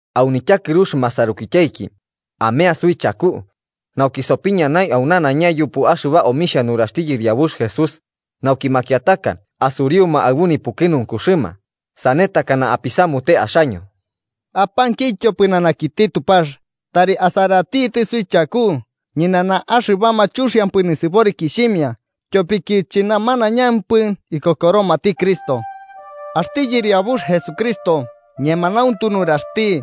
Au nityakɨrux masarukityaiki, amea suichaku, nauki sopiñanai au nanaiña yupu axɨba omixhia nuraxti Yɨriabux Jesús, nauki makiataka asuriuma aɨbu nipukɨnunkuxɨma, sane takana apisamute axaño. Apankityo pɨnanakiti Tupax tari asaratitɨ suichaku ñɨnanama axɨbama chuxiampɨ nisɨborikixhimia, tyopiki chɨnamanaiñampɨ ikokoromati Cristo. Axti Yɨriabux Jesucristo ñemanauntu nuraxti,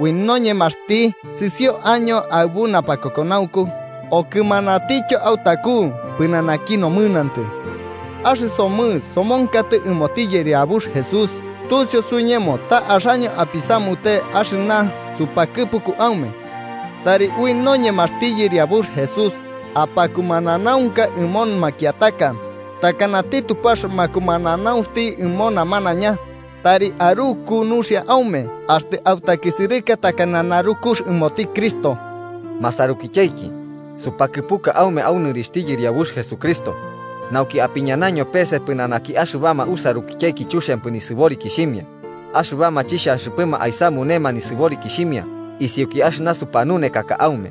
ui noñemaxti sɨsio año aɨbu napakokonaunku okɨmanatityo autaku pɨnanaki nomɨnantɨ. Axɨsomɨ somonkatɨ ɨmoti Yɨriabux Jesús tusiu suiñemo ta axaño apisamute axɨna supakɨpuka aume. Tari ui noñemaxti Yɨriabux Jesús apakumananaunka ɨmo makiataka takanati Tupax makumananaunxti ɨmo namanaiña, tari aruku nuxia aume axtɨ autakisɨrɨka takana narukux ɨmoti Cristo. Masarukityaiki supakɨpuka aume au nɨrixhti Yɨriabux Jesucristo, nauki apiñanaño pese pɨnanaki axɨbama usarukityaiki chuxiampɨ nisɨborikixhimia, axɨbama chixhanxɨpɨma aisamunema nisɨborikixhimia isiuki axɨna supanunekaka aume.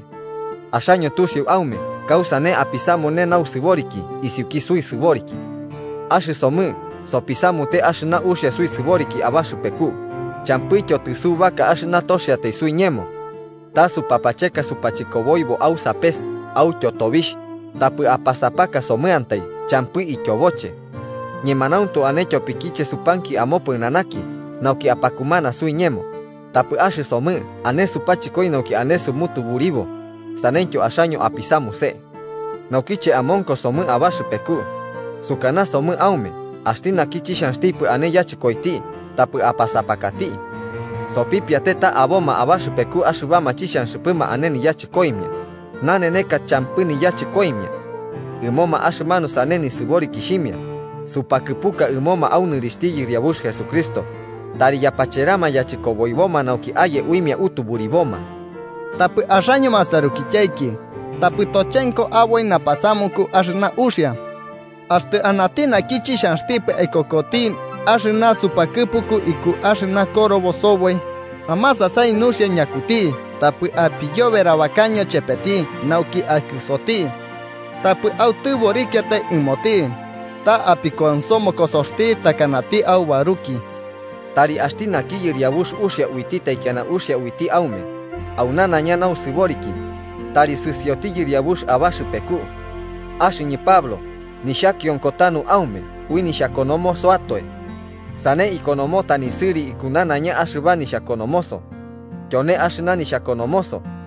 Axaño tusiu aume kausane apisamune nausɨboriki isiuki suisɨboriki: axɨsomɨ sopisamute axɨna uxia suisɨboriki abaxɨpeku, champɨityo tɨsubaka axɨna toxiatai suiñemo. Ta supapacheka supachɨkoboibo au sapes autyo tobixh, tapɨ apasapakasomɨantai champɨ ityoboche. Ñemanauntu ane tyopikiche supanki amopɨnanaki nauki apakumana suiñemo, tapɨ axɨsomɨ ane supachɨkoi nauki ane sumutuburibo saneityo axaño apisamuse. Naukiche amonkosomɨ abaxɨpeku, sukanasomɨ aume axti naki chixhanxtipɨ ane yachɨkoiti tapɨ apasapakati. Sopipiate ta aboma abaxɨpeku axɨbama chixhanxɨpɨma ane niyachɨkoimia, naneneka champɨ niyachɨkoimia. Ɨmoma axɨmanuma sane nisɨborikixhimia supakɨpuka ɨmoma au nɨrixhti Yɨriabux Jesucristo, tari yapacherama yachɨkoboiboma nauki aye uimia utuburiboma. Tapɨ axaño masarukityaiki, tapɨ tochenko aboi napasamuku axɨna uxia. Axtɨ anati naki chixhanxtipɨ aikokoti axɨna supakɨpuku iku axɨna korobo soboi, amasasai nuxia ñakuti tapɨ apiyoberabakaño chepeti nauki akɨsoti. Tapɨ autɨborikiatai ɨmoti, ta apikuansomokosoxti takanati aubaruki. Tari axti naki Yɨriabux uxia uiti taikiana uxia uiti aume, au nanaiña nausɨboriki, tari sɨsioti Yɨriabux abaxɨpeku. Axɨñɨ Pablo, nixhakionko tanu aume ui nixhakonomosoatoe. Sane ikonomota nisɨri iku nanaiña axɨba nixhakonomoso. Tyone axɨna nixhakonomoso.